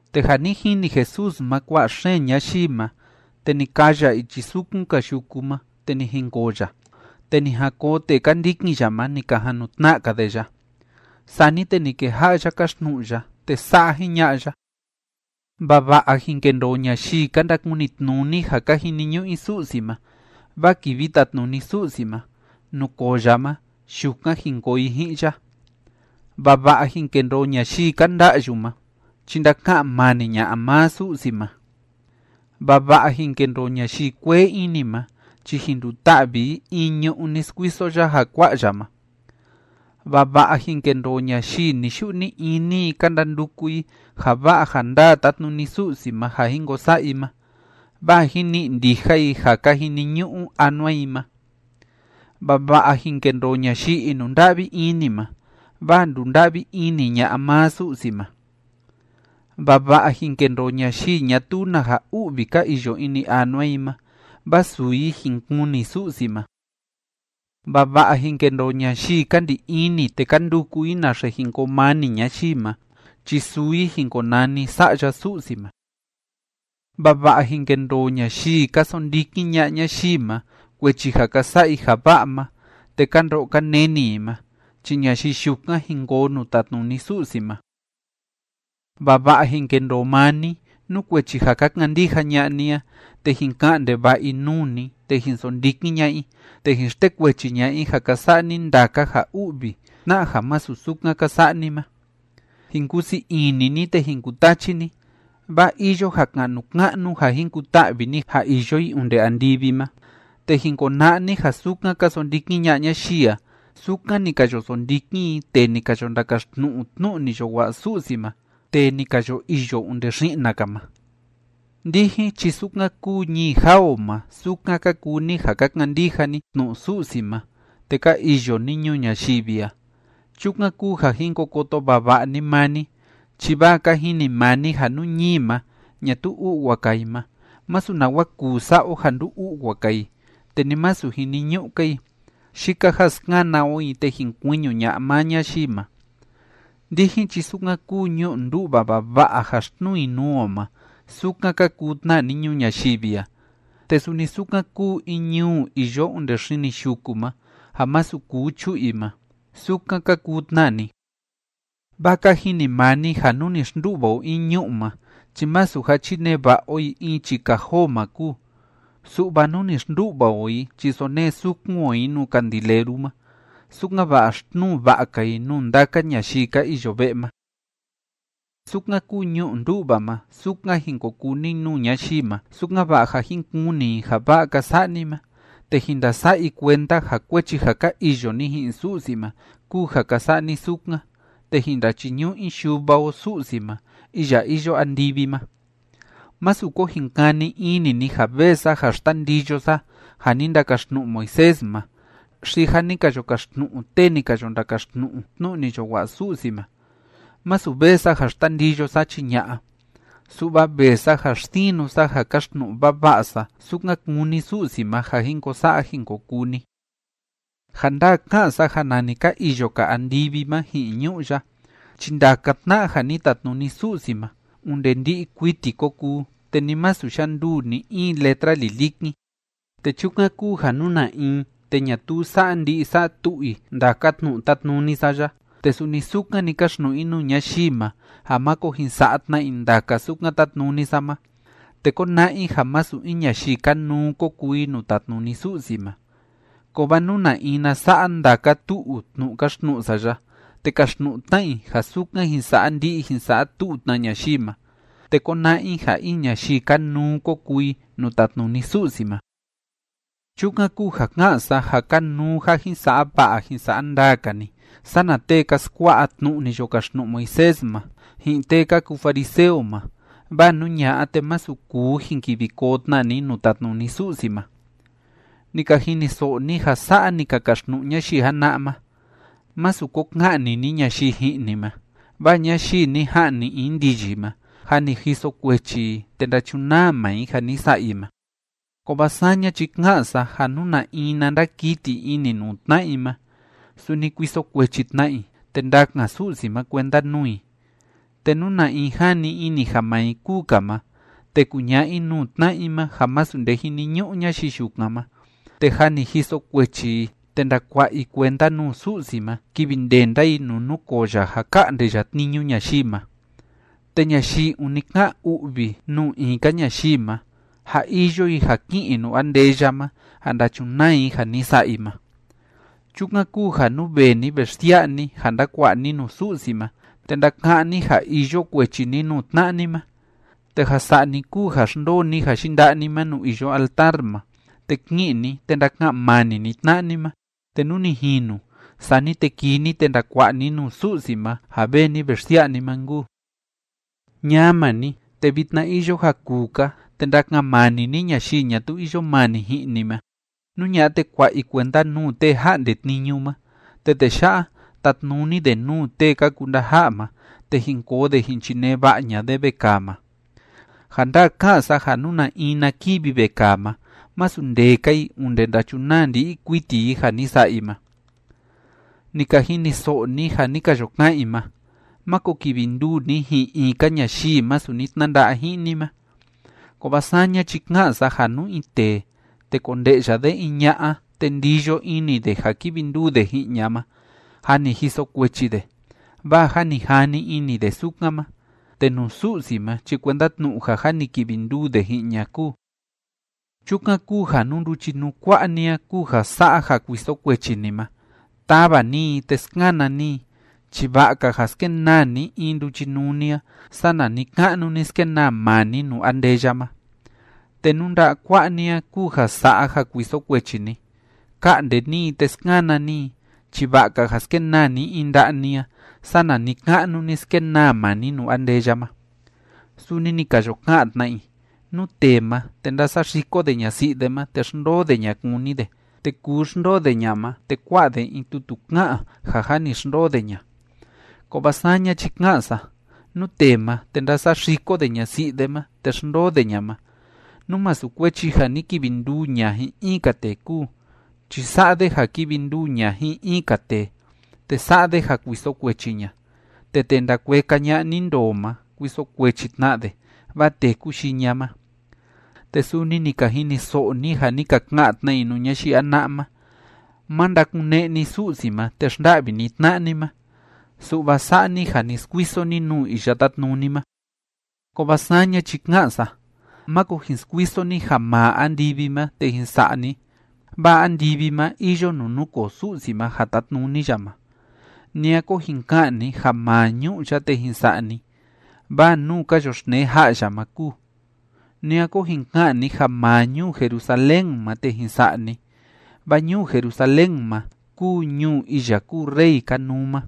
Te ja ni jini Jesús ma kua'a xeen ñayii ma, te ni kaa ya ichi sukun‑ka yuku ma, te ni jinkoo ya. Te ni jan koo tee ka ndikin ya ma, ni ka jan nu tna'a‑ka de ya. Sani te ni keja'a ya káxtnu'u ya, te sa'a jiña'a ya: ―Vava'a jin kendoo ñayii ka ndakunitnuni ja ka jiniñu'u i Su'si ma, vaa kivi tatnuni Su'si ma, nuu koo ya ma, yukan jin koo i ji'in ya. ’Vava'a jin kendoo ñayii ka nda'yu ma chi ndaka'an mani ña'a maa Su'si ma. ’Vava'a jin kendoo ñayii kuee ini ma chi jin nduta'vi i in ñu'ú ni skuiso ya ja kua'a ya ma. ’Vava'a jin kendoo ñayii ni‑yu'u ni‑ini i ka ndanduku i ja va'a ja ndaa tátnuni Su'si ma ja jin ko sa'a i ma, vaa jin ni'i ndija i ja ka jiniñu'u anua i ma. ’Vava'a jin kendoo ñayii inunda'vi ini ma, vaa ndunda'vi ini ña'a maa Su'si ma. ’Vava'a jin kendoo ñayii ñatuu na ja u'vi ka iyo ini anua i ma, vaa suu i jin kuni Su'si ma. ’Vava'a jin kendoo ñayii ka ndi ini te ka nduku i naxe jin koo mani ñayii ma chi suu i jin konani sa'ya Su'si ma. ’Vava'a jin kendoo ñayii ka sondikin ña'a ñayii ma kuechi ja ka sa'a i ja va'a ma te ka ndo'o ka neni i ma chi ñayii yukan jin koo nuu tatnuni Su'si ma. ’Vava'a jin kendoo maa ni, nú kuechi ja ka kandija ña'a ni a, te jin ka'an ndeva'a i nuu ni, te jin sondikin ña'a i, te jin xtekuechi ña'a i ja ka sa'a ni ndaka ja u'vi tna'a ja masu sukan ka sa'a ni ma. Jin kusii ini ni, te jin kutachi ni, vaa iyo ja ka'nu ka'nu ja jin kuta'vi ni ja iyo i onde andivi ma, te jin kona'a ni ja sukan ka sondikin ña'a ñayii a, sukan ni ka yo sondikin i tee ni ka yo ndakaxtnu'u tnu'u ni yo wa'a Su'si ma, tee ni ka yo iyo onde xi'na‑ka ma. ’Ndijin chi sukan kúu ñii jaa o ma sukan ka kuu ni ja ka kandija ni tnu'u Su'si ma te ka iyo ni ñuu ñayivi a. Chukan kúu ja jin ko koto vava'a ni maa ni, chi vaa ka jini maa ni ja nú ñii ma, ñatuu u'wa‑ka i ma, masu nawa kuu sa'a o ja ndu‑u'wa‑ka i, te ni masu jiniñu'u‑ka i. Yika ja skana o i te jin kuiñu ña'a maa ñayii ma. ’Ndijin chi sukan kúu ñu'u ndú'va vava'a ja xtnuu i nuu o ma, sukan ka kuu tna ni ñuu ñayivi a, te suni sukan kúu in ñuu iyo onde xini yuku ma ja masu kuu chu'u i ma, sukan ka kuu tna ni. Vaa ka jini maa ni ja nú ni xndu'va o in ñu'u ma chi masu ja chinee va'a o i in chii kajoo ma kúu, su'va nú ni xndu'va o i chi sonee sukun o i nuu candileru ma, sukan‑va'a xtnuu va'a‑ka i nuu ndaka ñayii ka iyo ve'e ma. Sukan kúu ñu'u ndú'va ma, sukan jin ko kuu ni nuu ñayii ma, sukan‑va'a ja jin kuni i ja va'a ka sa'a ni ma, te jin ndasa'a i kuenda ja kuechi ja ka iyo ni ji'in Su'si ma kúu ja ka sa'a ni sukan, te jin ndachiñu'u i Yuva o Su'si ma iya iyo andivi ma. ’Másu ko jin kani ini ni ja vee sa ja xtandiyo sa ja ni ndakaxtnu'u Moisés ma xi ja ni ka yo kaxtnu'u tee ni ka yo ndakaxtnu'u tnu'u ni yo wa'a Su'si ma. Masu vee sa ja xtandiyo sa, chi ña'a, su'va vee sa ja xsinu sa ja kaxtnu'u vava'a sa sukan kúni Su'si ma ja jin ko sa'a jin ko kuu ni. Ja ndaa ká'an sa ja nani ka iyo‑ka andivi ma ji'in ñu'ú ya, chi ndaka tna'a ja ni tatnuni Su'si ma onde ndi'i kuiti ko kuu, te ni masu yanduu ni‑in letra lilikin. Te chukan kúu ja nú na in te ñatuu sa'a ndi'i sa'a tu'u i ndaka tnu'u tátnuni sa ya te suni sukan‑ni káxtnu'u i nuu ñayii ma ja máko jin sa'a tna i ndaka sukan tátnuni sa ma, te kóna'a i ja masu in ñayii kanuu ko kuu i nuu tatnuni Su'si ma. Kovaa nú na in na sa'a ndaka tu'u tnu'u káxtnu'u sa ya te káxtnu'u tna i ja sukan jin sa'a ndi'i jin sa'a tu'u tna ñayii ma, te kóna'a i ja in ñayii kanuu ko kuu i nuu tatnuni Su'si ma. Chukan kúu ja ká'an sa ja kanuu ja jin sa'a va'a jin sa'a ndaa‑ka ni sana tee ka skua'a tnu'u ni yo kaxtnu'u Moisés ma, ji'in tee ka kuu fariseo ma, vaa nú ña'a, te masu kuu jin kivi koo tna ni nuu tatnuni Su'si ma. ’Ni ka jiniso'o ni ja sa'a ni ka kaxtnu'u ñayii jana'a ma: “Másu ko ka'ni ni ñayii ji'in ni ma, vaa ñayii ni ja'ni in ndiyi ma, jâ ni jiso kuechi i te ndachunaa maa i ja ni sa'a i ma.” Kovaa saña chi ká'an sa ja nú na in na ndakiti ini nuu tna'a i ma, suni kuiso kuechi tna i te ndakan Su'si ma kuenda nuu i. Te nú na in jani ini ja maa i kúu‑ka ma te kuña'a i nuu tna'a i ma ja masu nde jiniñu'u ñayii yukan ma, te jâ ni jiso kuechi i te ndakua'a i kuenda nuu Su'si ma kivi ndenda i nuu núkoo ya ja ka'nde ya tniñu ñayii ma. Te ñayii ûni ká'an u'vi nuu in‑ka ñayii ma, jâ iyo i ja ki'in i nuu andeya ma ja ndachunaa i ja ni sa'a i ma. ’Chukan kúu ja nú vee ni ve xsia'a ni ja ndakua'a ni nuu Su'si ma te ndaka'án ni ja iyo kuechi ni nuu tna'a ni ma, te ja sa'a ni kúu ja xndoo ni ja yinda'a ni ma nuu iyo altar ma, te ki'in ni, te ndaka'an mani ni tna'a ni ma, te nú ni jinu, sani te kii ni te ndakua'a ni nuu Su'si ma ja vee ni ve xsia'a ni ma nkuu. ’Ñama ni, te vitna iyo ja kuu‑ka te ndaka'an mani ni ñayii ñatuu iyo mani ji'in ni ma. Nú ña'a te kua'a i kuenda nuu tee ja'nde tniñu ma, te tee ya'a tatnuni de nuu tee ka kuu ndaja'a ma, te jin koo de jin chinee va'a ña'a de vekaa ma. Ja ndaa ká'an sa ja nú na in na kivi vekaa ma, masu ndee‑ka i onde ndachunaa ndi'i kuiti i ja ni sa'a i ma. ’Ni ka jiniso'o ni ja ni ka yo ka'an i ma: “Máko kivi nduu ni ji'in in‑ka ñayii masu ni tnanda'a ji'in ni ma.” Kovaa saña chi ká'an sa ja nú in tee, te konde'ya de in ña'a te ndiyo ini de ja kivi nduu de ji'in ña ma, jâ ni jiso kuechi de, vaa jâ ni jani ini de sukan ma, te nuu Su'si ma chi kuenda tnu'u ja jâ ni kivi nduu de ji'in ña kúu. ’Chukan kúu ja nú nduchinuu kua'a ni a kúu ja sa'a ja kuiso kuechi ni ma, tava ni i te skana ni i chi va'a‑ka ja skenaa ni in nduchinuu ni a sana ni‑ka'nu ni skenaa maa ni nuu andeya ma. Te nú nda'a kua'a ni a kúu ja sa'a ja kuiso kuechi ni, ka'nde ni i te skana ni i chi va'a‑ka ja skenaa ni in nda'a ni a sana ni‑ka'nu ni skenaa maa ni nuu andeya ma. ’Suni ni ka yo ka'an tna i: “Nú tee ma, te ndásaxiko de ñasi'i de ma te xndoo de ña kúni de, te kuu xndoo de ña ma, te kuá'a de in tutu ká'an ja jâ ni xndoo de ña.” Kovaa saña chi ká'an sa, nú tee ma, te ndásaxiko de ñasi'i de ma te xndoo de ña ma, nú masu kuechi ja ni kivi nduu ña ji'in in‑ka tee kúu, chi sa'a de ja kivi nduu ña ji'in in‑ka tee, te sa'a de ja kuiso kuechi ña. Te tee ndakueka ña'a ni ndoo ma, kuiso kuechi tna de, vaa téku yii ña ma. ’Te suni ni ka jiniso'o ni ja ni ka ka'an tna i nuu ñayii jana'a ma: “Má ndakune'e ni Su'si ma te xnda'vi ni tna'a ni ma, su'va sa'a ni ja ni skuiso ni nuu Iya Tátnuni ma.” Kovaa saña chi ká'an sa, máko jin skuiso ni ja maa andivi ma te jin sa'a ni, vaa andivi ma iyo nuu núkoo Su'si ma ja tátnuni ya ma. Ni a ko jin ka'an ni ja maa ñu'ú ya'a te jin sa'a ni, vaa nuu ka yoxtnee ja'a ya ma kúu. Ni a ko jin ka'an ni ja maa ñuu Jerusalén ma te jin sa'a ni, vaa ñuu Jerusalén ma kúu ñuu iya kúu Rey Kanuu ma.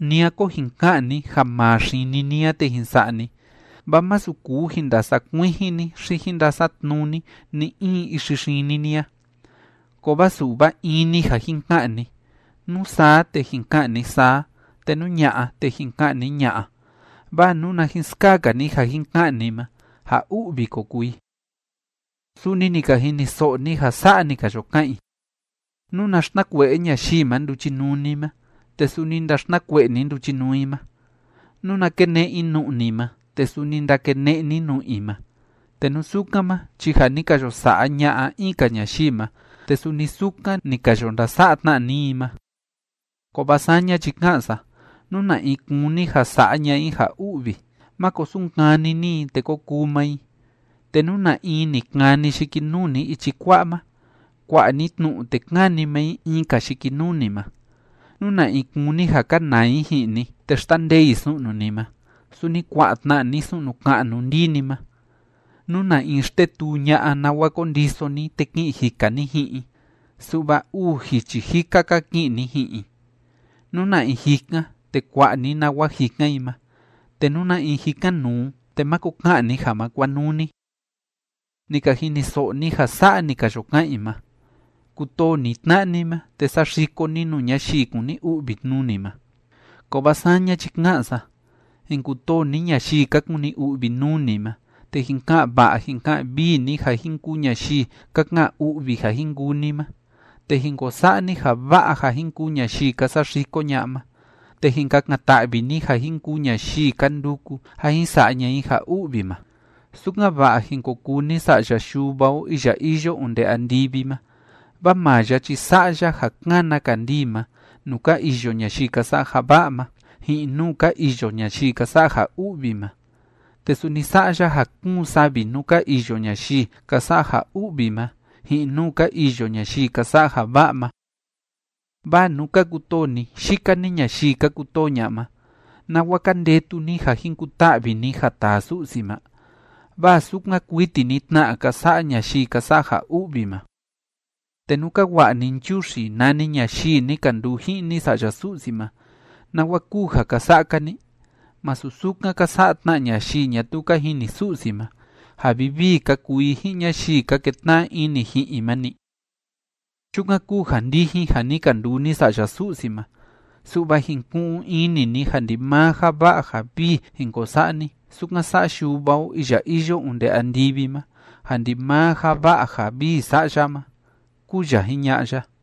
Ni a ko jin ka'an ni ja maa xini ni a te jin sa'a ni, vaa masu kuu jin ndasa'a kuijin ni xi jin ndasa'a tnuu ni ni‑in ixi xini ni a. Kovaa su'va in‑ni ja jin ka'an ni: nú saa te jin ka'an ni “saa”, te nú ña'a te jin ka'an ni “ña'a”, vaa nuna jin skaa‑ka ni ja jin ka'an ni ma, ja u'vi ko kuu i. ’Suni ni ka jiniso'o ni ja sa'a ni ka yo ka'an i: “Nuna xtnakue'e ñayii ma nduchinuu ni ma, te suni ndaxtnakue'e ni nduchinuu i ma. Nuna kene'e i nu'u ni ma, te suni ndakene'e ni nu'u i ma.” Te nú sukan ma, chi ja ni ka yo sa'a ña'a in‑ka ñayii ma, te suni sukan ni ka yo ndasa'a tna ni i ma. Kovaa saña chi ká'an sa, nú na in kúni ja sa'a ña'a i ja u'vi, máko sunkani ni i, te ko kuu maa i. Te nú na in ni kani yikinuu ni ichi kua'a ma, kua'a ni tnu'u, te káni maa i in‑ka yikinuu ni ma. Nú na in kúni ja kanaa i ji'in ni te xtandee i su'nu ni ma, suni kua'a tna ni su'nu ka'nu ndii ni ma. Nú na in xtetuu ña'a nawa kondiso ni te ki'in jika ni ji'in i, su'va uu jichi jika‑ka ki'in ni ji'in i. Nú na in jikan, te kua'a ni nawa jikan i ma. Te nú na in jikan nuu, te máko ka'an ni ja ma kuanuu ni. ’Ni ka jiniso'o ni ja sa'a ni ka yo ka'an i ma: “Kutoo ni tna'a ni ma, te saxiko ni nuu ñayii kúni u'vi nuu ni ma.” Kovaa saña chi ká'an sa: Jin kutoo ni ñayii ka kuni u'vi nuu ni ma, te jin ka'an va'a jin ka'an vii ni ja jin kuu ñayii ka ka'an u'vi ja jin kuu ni ma, te jin ko sa'a ni ja va'a ja jin kuu ñayii ka saxiko ña'a ma, te jin kakan‑ta'vi ni ja jin kuu ñayii ka nduku ja jin sa'a ña'a i ja u'vi ma, sukan‑va'a jin ko kuu ni sa'ya Yuva o iya iyo onde andivi ma. Vaa maa ya chi sa'a ya ja kána kandii ma nuu ka iyo ñayii ka sa'a ja va'a ma, ji'in nuu ka iyo ñayii ka sa'a ja u'vi ma, te suni sa'a ya ja kúun savi nuu ka iyo ñayii ka sa'a ja u'vi ma ji'in nuu ka iyo ñayii ka sa'a ja va'a ma. Vaa nú ka kutoo ni yika‑ni ñayii ka kutoo ña'a ma, ¿nawa ka ndetu ni ja jin kuta'vi ni ja taa Su'si ma? Vaa sukan kuiti‑ni tna ka sa'a ñayii ka sa'a ja u'vi ma. Te nú ka wa'a ni nchuxi nani ñayii ni ka nduu ji'in ni sa'ya Su'si ma, ¿nawa kúu ja ka sa'a‑ka ni? ¿Masu sukan ka sa'a tna ñayii ñatuu ka jini Su'si ma, ja vivii ka kuu i ji'in ñayii ka ketna'a ini ji'in i ma‑ni? Chukan kúu ja ndijin ja ni ka nduu ni sa'ya Su'si ma, su'va jin ku'un ini ni ja ndimaa ja va'a ja vii jin ko sa'a ni, sukan sa'a Yuva o iya iyo onde andivi ma ja ndimaa ja va'a ja vii sa'a ya ma ―kúu ya jiña'a ya.